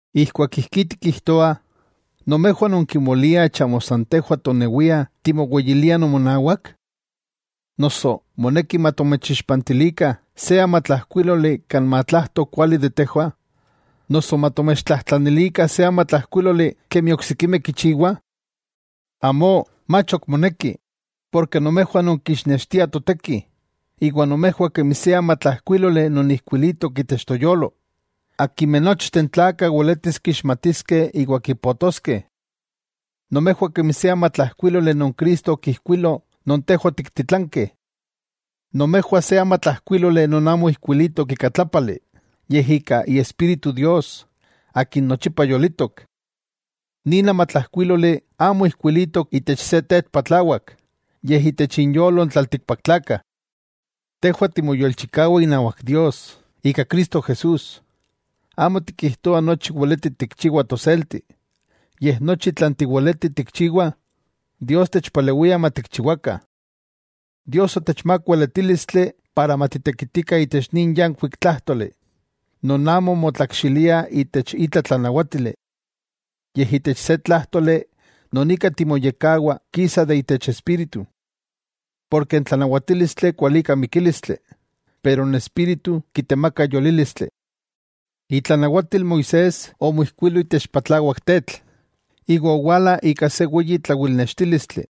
Ijkuak ijkí tikijtoah, ¿nomejwah nonkimoliah chamo san tejwah tonewiah timoweyiliah nomonawak? Noso, ¿moneki matomechixpantilikah se amatlajkuíloli kan matlajto kuali de tejwah, noso matomechtlajtlanilikah se amatlajkuíloli kemi oksikimeh kichiwah? Amó, mach ok moneki, porke nomejwah nonkixnextiah toteki, iwa nomejwah kemi se amatlajkuíloli non ijkuilitok itech toyolo, akimeh nochteh n tlakah weletis kixmatiskeh iwa kipotoskeh. Nomejwah kemi se amatlajkuíloli non Cristo okijkuilo non tejwah otiktitlankeh. Nomejwah se amatlajkuíloli non amo ijkuilitok ika tlápali, yej ika Iespíritu Dios Akin nochipa yolitok. Nin amatlajkuíloli amo ijkuilitok itech se tetl patlawak, yej itech inyolo n tlaltikpaktlakah. Tejwah timoyolchikawa inawak Dios, ika Cristo Jesús. Amo tikijtoah nochi weleti tikchiwah toselti, yej nochi tlan tiweletih tikchiwah, Dios techpalewia matikchiwakah. Dios otechmák weletílistli para matitekitikah itech nin yankuik tlájtoli, non amo motlakxilia itech itla tlanawátili. Yej itech se tlájtoli non ika timoyekkawah kisa de itech Espíritu. Porke n tlanawatílistli kualika mikílistli, pero n Espíritu kitemaka yolílistli. Itlanawatil Moisés omijkuilo itech patlawak tetl, iwa owala ika se weyi tlawilnextílistli.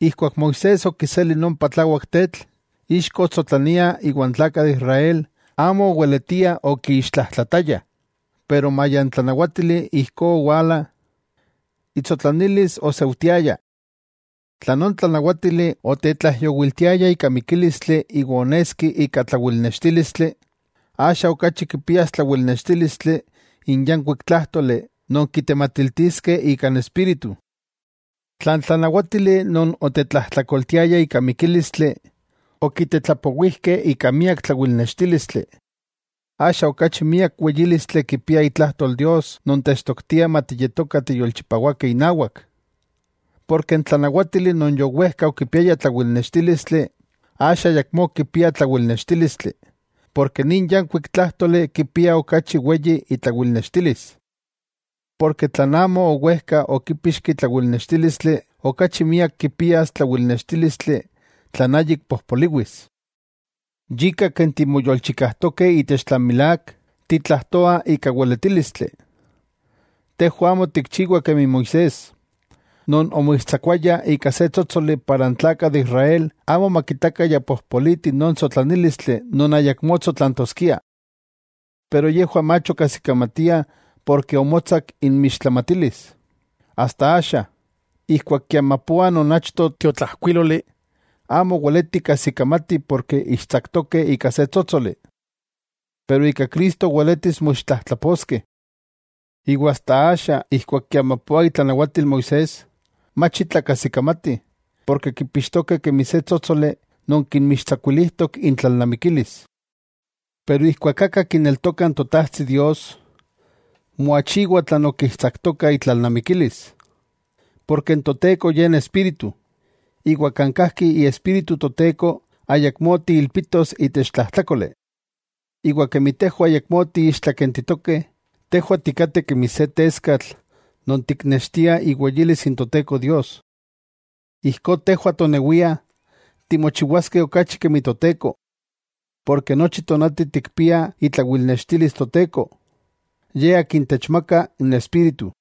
Ijkuak Moisés okiseli non patlawak tetl, ixko otsotlania iwa n tlakah de Israel amo oweletiah okiixtlajtlataya, pero maya n tlanawátili ijkó owala, itsotlanilis oseujtiaya. Tla non tlanawátili otetlaijyowiltiaya ika mikílistli iwa oneski ika tlawilnextílistli, ¡axa okachi kipias tlawilnextílistli n yankuik tlájtoli non kitematiltiskeh ika n Espíritu! Tla n tlanawátili non otetlajtlakoltiaya ika mikílistli, okitetlapowijkeh ika miak tlawilnextílistli, ¡axa okachi miak weyílistli kipia itlajtol Dios non techtoktia matiyetokah tiyolchipawakeh inawak! Porke n tlanawátili non yowejka okipiaya tlawilnextílistli, axa ayakmó kipia tlawilnextílistli, porke nin yankuik tlájtoli kipia okachi weyi itlawilnextilis. Porke tlan amo owejka okipixki tlawilnextílistli, okachi miak kipias tlawilnextílistli tlan ayik pojpoliwis. Yika ken timoyolchikajtokeh itech tlan milák, titlajtoah ika weletílistli. Tejwah amo tikchiwah kemi Moisés, non omoixtsakuaya ika se tsótsoli para n tlakah de Israel amo makitakah ya pojpoliti non tsotlanílistli non ayakmó tsotlantoskia. Pero yejwah mach okajsikamatia porke omotsak inmixtlamatilis, asta axa, ijkuak kiamapoa non achto tiotlajkuíloli, amo weletih kajsikamatih porke ixtsaktokeh ika se tsótsoli. Pero ika Cristo weletis moixtlajtlaposkeh. Iwa asta axa ijkuak kiamapoah itlanawatil Moisés, mach itla kajsikamatih, porke kipixtokeh kemi se tsótsoli non kinmixtsakuilijtok intlalnamikilis. Pero ijkuak aka kineltoka n Totajtsi Dios, moachiwa tlan okixtsaktoka itlalnamikilis. Porke n Toteko Ye n Espíritu, iwa kan kajki Iespíritu Toteko ayakmó tiilpitos itech tlajtlákoli. Iwa kemi tejwah ayakmó tiixtlakentitokeh, tejwah tikateh kemi se teskatl non tiknextiah iweyilis n Toteko Dios. Ijkó tejwah tonewia timochiwaskeh okachi kemi Toteko. Porke nochi tonati tikpiah itlawilnextilis Toteko, Ye Akin techmaka n Espíritu.